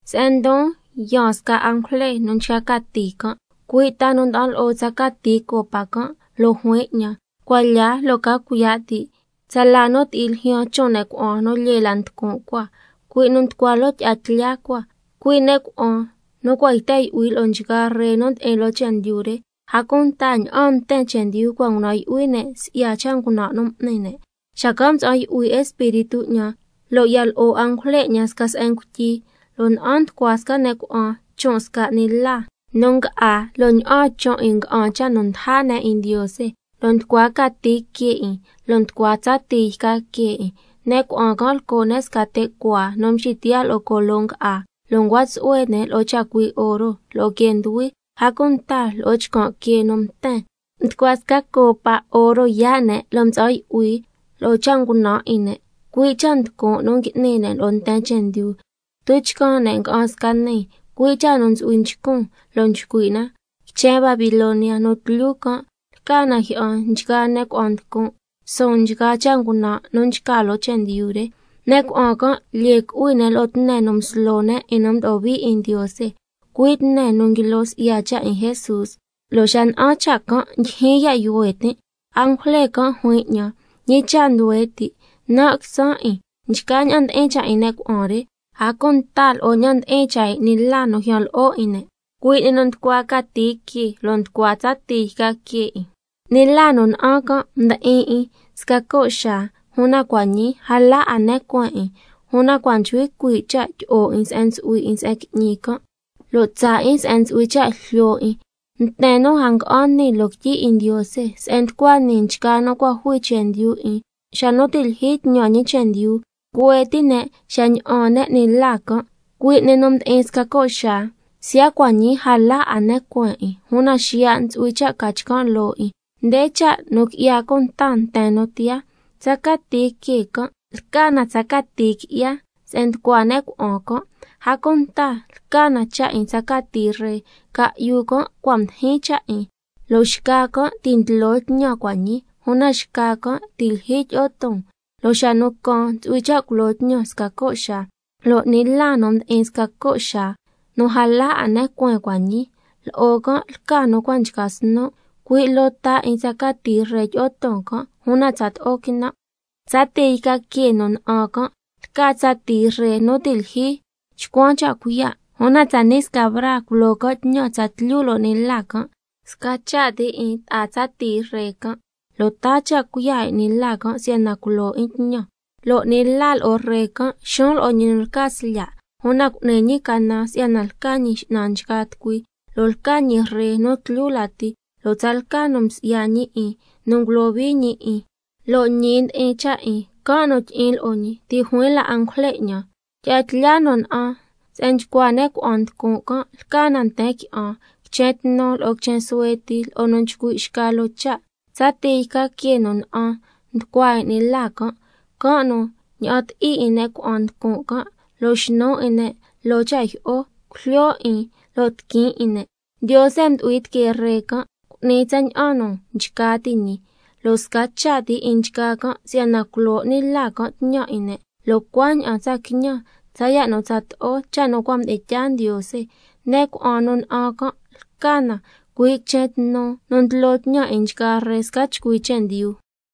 Se'en ndon yaan sca angujle nu nchca cati can', cui' ta nu nda'an lo'o tsa cati copa can', lo' juin 'ñan: Cuan lya lo' ca cuiya' ti' tsala nu ti'i ljyaan chon' ne' cuna'an nu lyee la nducun' cua, cui' nu nducua loo tyi'a tlya cua, cui' ne' cuna'an nu cua' yten yu'hui lo'o nchgaa ree nu ndi'in loo chendyu re, a cunta ña'aan nten chendyu cua' ngunan' yu'hui ne' si'ya cha' ngunan' nu m'ni ne'. Xacan' mtsa'an yu'hui Espíritu 'ñan lo' ya lo'o angujle 'ñan sca se'en ngutyi, lo' na'an nducua sca ne' cuna'an chon' sca 'ni la nu nga'á, lo' ña'aan chon' 'in nga'an cha' nu ndaja ne' 'in Ndiose, lo' nducua cati que 'in lo' nducua tsa tii yca que 'in. Ne' cuna'an can' lco' ne' sca te' cuaa nu mxitiyaa' lo'o colo nga'á, lo' ncua tsu'hue ne' lo'o chacui' oro, lo'o quee nduhui, a cunta lo'o chcan' quee nu mten. Nducua sca copa oro yaa' ne' nu mtsa'an yu'hui lo'o cha' ngunan' 'in ne', cui' cha' nducun' nu ngui'ni ne' lo'o nten chendyu. Tuchcan ne' nga'an sca nii, cui' cha' nu ntsu'hui nchcun, lo' nchcui' na: Quichen Babilonia nu tlyu can', lca na jyi'an nchgaa ne' cuna'an nducun', suun nchgaa cha' ngunan' nu nchca loo chendyu re. Ne' cuna'an can' lyee cu'hui ne' lo'o tne nu mslo ne' 'in nu mdo'o hui 'in Ndiose, cui' tne nu nguilo si'ya cha' 'in Jesús, lo' xa na'an cha' can' ndyijyin ya' yuhue tin'. Angujle can' juin 'ñan: ¿Ñi cha' nduhue ti'? Nan' quitsan' 'in nchgaa ña'an ndi'in cha' 'in ne' cuna'an re, a cunta lo'o ña'an ndi'in cha' 'in 'ni la nu ljyan lo'o 'in ne', cui' 'ni nu nducua cati que lo' nducua tsa tii yca que 'in. 'Ni la nu na'an can' mdi'in 'in sca co' xaa, una cua' ñii a la 'a ne cueen 'in, una cua' nchcui cuii' cha' tyi'o 'in se'en ntsu'hui 'in se'en qui'ñi can', lo' tsaa 'in se'en ntsu'hui cha' jlyo 'in. Nten nu a nga'an nii loo quityi 'in Ndiose, se'en nducua nii nchgaa nu cua' jui chendyu 'in xa nu ti' lyijyi tñan ñi chendyu, cuhue ti' ne' xa ña'an ne' 'ni la can', cui' 'ni nu mdi'in sca co' xaa, siya' cua' ñii a la 'a ne cueen 'in, una xiya' ntsu'hui cha' ca chcan' loo 'in. Nde cha' nu qui'ya cunta nten nu tiyaa: Tsa cati que can' lca na tsa cati qui'ya se'en nducua ne' cuna'an can', a cunta lca na cha' 'in tsa cati ree, ca'yu can' cua' mdijin cha' 'in, lo' xca can' ti' ndlo tñan cua' ñii, una xca can' ti' lyijyi tyi'o ton, lo' xa nu caan ntsu'hui cha' culo tñan sca co' xaa. Lo' 'ni la nu mdi'in sca co' xaa, nu a la 'a ne cueen cua' ñii, lo'o can' lca nu cua' nchca snu', cui' loo ta 'in tsa cati ree tyi'o ton can', una tsato'o quinan'. Tsa tii yca que nu na'an can' lca tsa tii ree nu ti' lyijyi chcuan cha' cuiya', una tsani' sca braa culo can' tñan tsatlyu lo'o 'ni la can'. Sca cha' ti 'in ta'a tsa tii ree can', lo' taa cha' cuiya' 'in 'ni la can' si'yana culo 'in tñan. Lo' 'ni la lo'o ree can' xuun lo'o ñi nu lca Slya', una cu'ni ñi canan si'yana lca Ñi X'nan nchgaa tucui, lo' lca ñi Ree nu tlyu lati, lo' tsalca nu msi'ya ñi 'in, nu ngulohui ñi 'in, lo' ñi ndi'in cha' 'in, can' nu tyi'in lo'o ñi xacan'. Ti' juin la angujle 'ñan: Tyi'a tlya nu na'an se'en nchcua ne' cuna'an nducun' can', lca na nten qui'an, quichen tnu lo'o quichen suhue ti, lo'o nu nchcui' xca loo cha'. Tsa tii yca que nu na'an nducua 'in 'ni la can', can' nu ña'an ti'i 'in ne' cuna'an nducun' can', lo' xnu 'in ne' loo cha' jyi'o, cujlyo 'in lo' tiquin 'in ne'. Ndiose mdu'hui tiquee ree can' cu'ni tsaña'an nu nchca ti' ñi, lo' sca cha' ti 'in nchgaa can' si'yana taa cha' cuiya' culo 'ni la can' tñan, lo' cuaña'an tsa quiñan tsaya' nu tsato'o cha' nu cua' mdi'in tyaa Ndiose. Ne' cuna'an nu na'an can' lca na cui' quichen tnu nu ndlo tñan 'in nchgaa ree sca chcui chendyu.